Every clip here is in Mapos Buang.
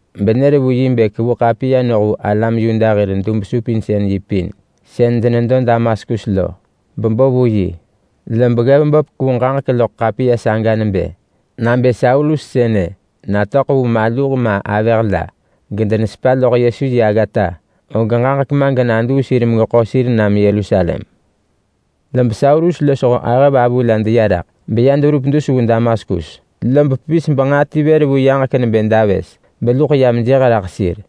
benër vu yi bë kevu ḳapiya noh vu alam Yuda hir dub-supinsën-yi pin sën denedo Damaskus lo bebo vu yi. Lob ggev böp kevu ġaġek loḳ ḳapiya saga nebë, “Nabë Saulus sënë natöḳ vu maluh ma avëh la gedenesepa loḳ Yesu yi aggata, og ġaġek ma genaduu sir megeḳo sir nam Yerusalem.” Log Saulus losho ahëvavu la deya raḳ beya deverup dus vu Damaskus, lob pevis benġaa ti vër vu yaġek nebë davës beluḳ yam jëh raḳ sir.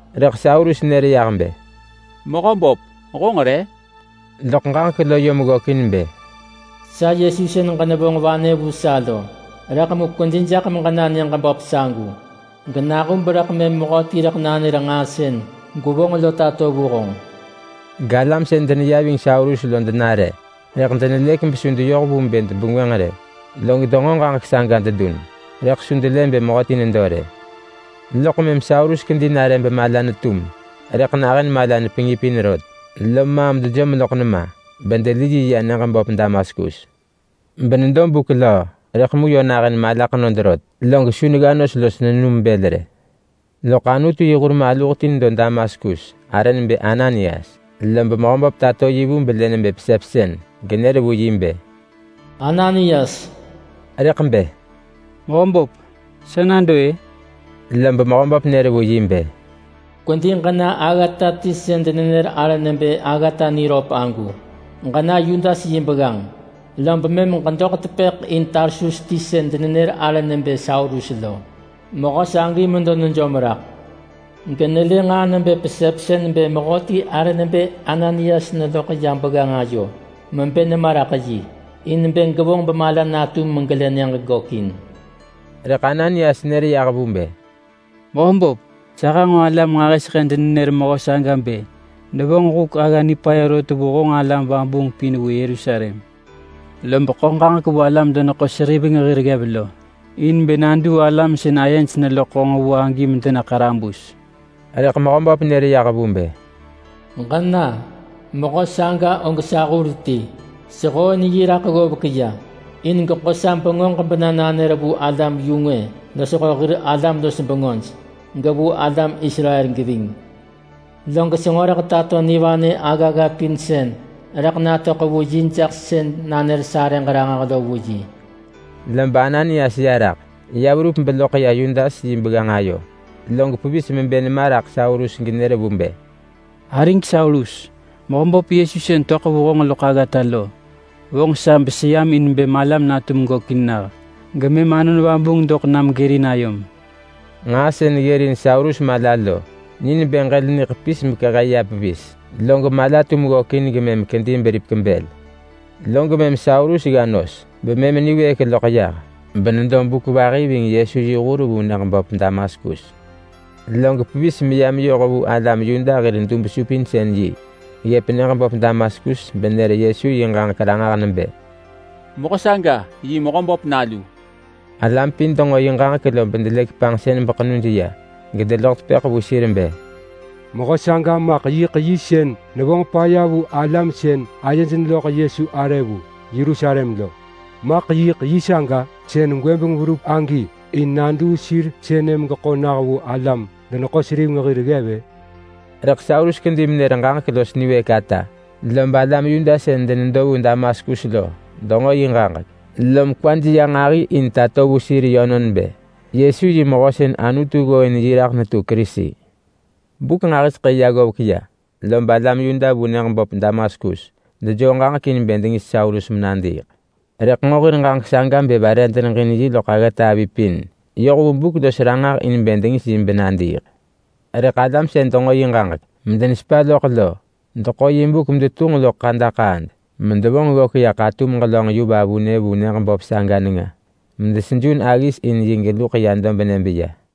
Rëḳ Saulus nër yah bë, “Mehöböp, honġ re?” Rëḳ ġaġek lo yom ggökin bë, “Sa Yesu sën ġenevonġ vanë vu sa lo. Rëḳ mu kwedi jaḳ meġena nyëġ böp sagu, genahub rëḳ mëm mehöti rëḳ nanër nġaa sën gwevonġ lo tato vu honġ!” Galam sën deneya ving Saulus lo denare rëḳ denelëk besu deyoh vu bë debengwënġ rë. Log denġo ġaġek saga dedun rëḳ su delë bë mehöti nedo rë. Loḳ mëm Saulus kedi nare bemala netum rëḳ nahën mala nepengipin rot, lom maam dejom loḳ nema bedeli yi ya nyëġ böp Damaskus. Benedo buk löö, rëḳ mu yö nahën mala ḳenod rot, log su negga nos los nenum bël rë. Loḳ Anutu yi hur maluh ti nedo Damaskus arë nebë Ananias. Lob Mehöböp tato yi vu belë nebë pesepsën, genër vu yi bë, “Ananias!” Rëḳ bë, “Mehöböp, sa nado-ë!” Lob Mehöböp nër vu yi bë, “Kwedi ġena aggata ti sën denenër arë nebë Aggata Niröp agu. Ġena Yudas yi begganġ lob mëm ġedoḳ tepëḳ in Tarsus ti sën denenër arë nebë Saulus. Mehö sagi medo nejom raḳ genelë nġaa nebë pesepsën bë mehöti arë nebë Ananias neloḳ ya begganġ ayo mebë nema raḳ yi in bë gevonġ bemala natum megelë nyëġ gökin.” Rëḳ Ananias nër yah vu bë, “Mehöböp, sa hanġo alam nġahiseḳë denenër mehö saga bë nevonġ huk agga nipaya rot vu honġ alam vabuung pin vu Yerusalem, lob ḳo ġaġek vu alam-deneḳo-seriveng hir ggev in bë naduu alam sën ayej neloḳ honġ vu agi, in bë dena ḳarabus.” Rëḳ Mehöböp nër yah vu bë, “Ġena! Mehö saga og sa hur ti. Sehooin yi raḳ ggovek ya in geḳo sa bengöġ bena nanër vu alam-yu-ngwë losho hir alam-los-bengöj, gevu alam Israel geving. Log senġo rëḳ tato nivanë aggagga pin sën rëḳ natöḳ vu yi jaḳ sën nanër sarëġ ranġah lo vu yi.” Lob Ananias ya raḳ. Ya verup beloḳ ya Yudas yi begganġ ayo log pevis mebë nema raḳ Saulus genër vu bë, “Arig Saulus! Mehöböp Yesu sën töḳ vu honġ loḳ aggata lo vonġ sa beseyam in bë malam natum gökin nah, gemëm Anon Vabuung doḳ nam gërin ayom.” Nġaa sën ggërin Saulus mala lo ni nebë ġël niḳepis mekehe ya pevis, log mala tum ggökin gemëm kedi beripek bël. Log mëm Saulus gga nos bemëm niwëëk loḳ yah, benedo buk vahi ving Yesu yi hur vu nyëġ böp Damaskus. Log pevis meya meyoh vu alam Yuda hir dub-supinsën-yi ggëp nyëġ böp Damaskus benër Yesu yi ġaġek ranġah nebë, “Mehö saga yi Mehöböp Nalu!” Alam pin denġo yi ġaġek lob delëk panġsën beḳenuj ya gedeloḳ tepëḳ vu sir bë, “Mehö saga maḳ sën yiḳ nevonġ paya vu alam sën ayej neloḳ Yesu arë vu Yerusalem lo! Maḳ yiḳ yi saga sën gwëbeng verup agi in naduu sir sënë megeḳo nah vu alam-deneḳo-seriveng hir ggev-ë?” Rëḳ Saulus kedi menër ġaġek los niwëëk ata, lob alam Yuda sën denedo vu Damaskus lo denġo yi ġaġek, lom kwaj ya nġahi in tato vu sir yönon bë Yesu yi mehö sën Anutu ggooin yi raḳ netu Kerisi. Buk nġahiseḳë ya ggovek ya lob alam Yuda vu nyëġ böp Damaskus dejoo ġaġek in bë dengis Saulus menadiiḳ. Rëḳ nġo hir ġaġek saga bë vare deneġin yi loḳ aggata avi pin yoh vu buk los ranġah in bë dengis yi benadiiḳ. Rëḳ alam sën denġo yi ġaġek medenesepa loḳ lo deḳo yi buk medetunġ loḳ ḳadaḳaad medevonġ ggök ya ḳatum ġelönġ yu vavunë vu nyëġ böp saga nenga, medesejun aggis in yi geluḳ ya dobnë beya.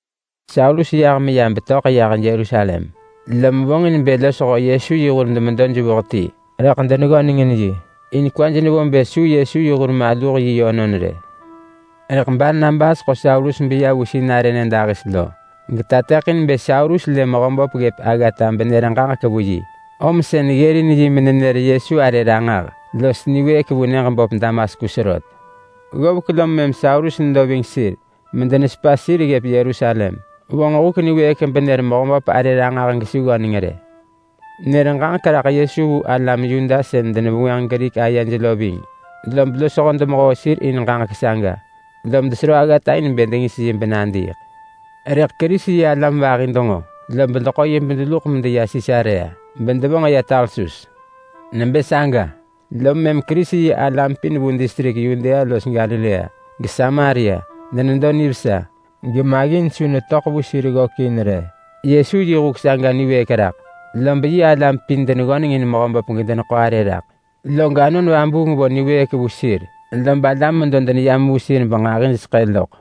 Saulus yah meya betöḳ yah Yerusalem, lom vonġin bë losho Yesu yi hur demedo jevuh ti, rëḳ deneggöneng in yi, in kwaj nevo bë su Yesu yi hur maluh yi yönon rë. Rëḳ Barnabas ḳo Saulus beya vu sinarë nyëdahis lo, getateḳin bë Saulus lë Mehöböp ggëp aggata benër ġaġek vu yi om sën ggërin yi menenër Yesu arë ranġah los niwëëk vu nyëġ böp Damaskus rot. Ggovek lom mëm Saulus nedo ving sir medenesepa sir ggëp Yerusalem. Vonġ huk niwëëk benër Mehöböp arë ranġah gesu ggöneng rë. Nër ġaġek raḳ Yesu vu alam Yuda sën denevengwënġ Grik ayej lo ving, lob losho denemehoo sir in ġaġek saga, lom desero aggata in bë dengis yi benadiiḳ. Rëḳ Kerisi-yi-alam vahi denġo, lob deḳo yi bedeluḳ medeya Sisarea, bedevonġ ya Tarsus. Nebë saga lom mëm Kerisi-yi-alam pin vu distrik Yudea los Galilea geSamaria denedo nivesa gemaggin su netöḳ vu sir ggökin rë. Yesu yi huk saga niwëëk raḳ, lob yi alam pin deneggöneng in Mehöböp gedeneḳo arë raḳ, log Anon Vabuung vo niwëëk vu sir lob alam medo deneyam vu sir benġahijseḳë loḳ.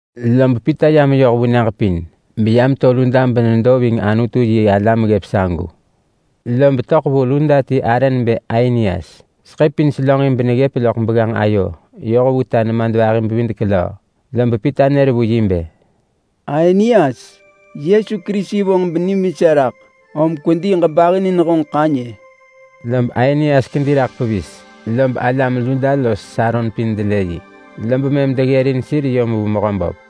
Lob Pita ya meyoh vu nyëġ pin beya meto Luda benedo ving Anutu-yi-alam ggëp sagu. Lob töḳ vu Luda ti arë nebë Ainias. Seḳë pin selönġin beneggëp loḳ begganġ ayo yoh vu ta nemadvahi-bevidek-löö. Lob Pita nër vu yi bë, “Ainias! Yesu Kerisi vonġ benim vesa raḳ. Om kwedi ġebahinin honġ ḳanyë!” Lob Ainias kedi raḳ pevis. Lob alam Luda los Saron pin delë yi, lob mëm deggërin sir yom vu Mehöböp.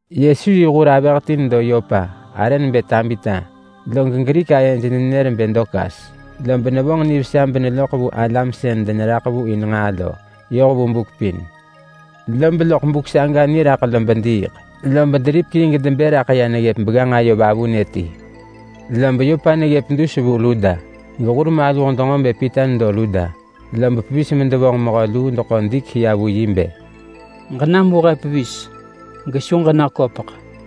Yesu yi hur avëh ti nedo Yopa arë nebë Tabita. Sën Grik ayej nenër nebë Dorkas lo. Lob nevonġ nivesa beneloḳ vu alam sën deneraḳ vu in nġaa lo yoh vu buk pin. Lob loḳ buk saga niraḳ lob diiḳ. Lob deripek yi gedebë raḳ ya neggëp begganġ ayo vavunë ti. Lob Yopa neggëp dus vu Luda, gehur maluh denġo bë Pita nedo Luda, lob pevis medevonġ mehö luu deḳo dik ya vu yi bë, “Ġenam vu he pevis, gesu ġenaköpeḳ!”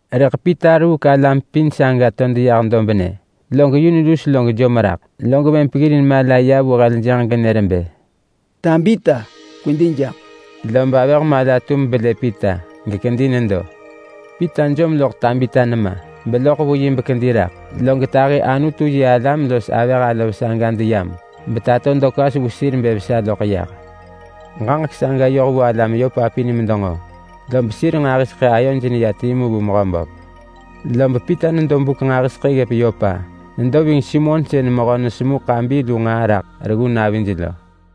Rëḳ Pita ruuk alam pin saga to deyah dobnë, log yun lus log jom raḳ. Log mëm peggirin mala ya vu heljënġ genër bë, “Tabita, kwedi jaḳ!” Lob avëh mala tum belë Pita gekedi nedo. Pita jom loḳ Tabita nema beloḳ vu bekedi raḳ, log tahi Anutu-yi-alam los avëh alov saga deyam betato Dorkas vu sir bë vesa loḳ yah. Ġaġek saga yoh vu alam Yopa pin medenġo, lob sir nġahiseḳë ayoj neya timu vu Mehöböp. Lob Pita nedo buk nġahiseḳë ggëp Yopa. Nedo ving Simon sën mehö nesemu ḳabi lu nġaa raḳ reggu navi lo.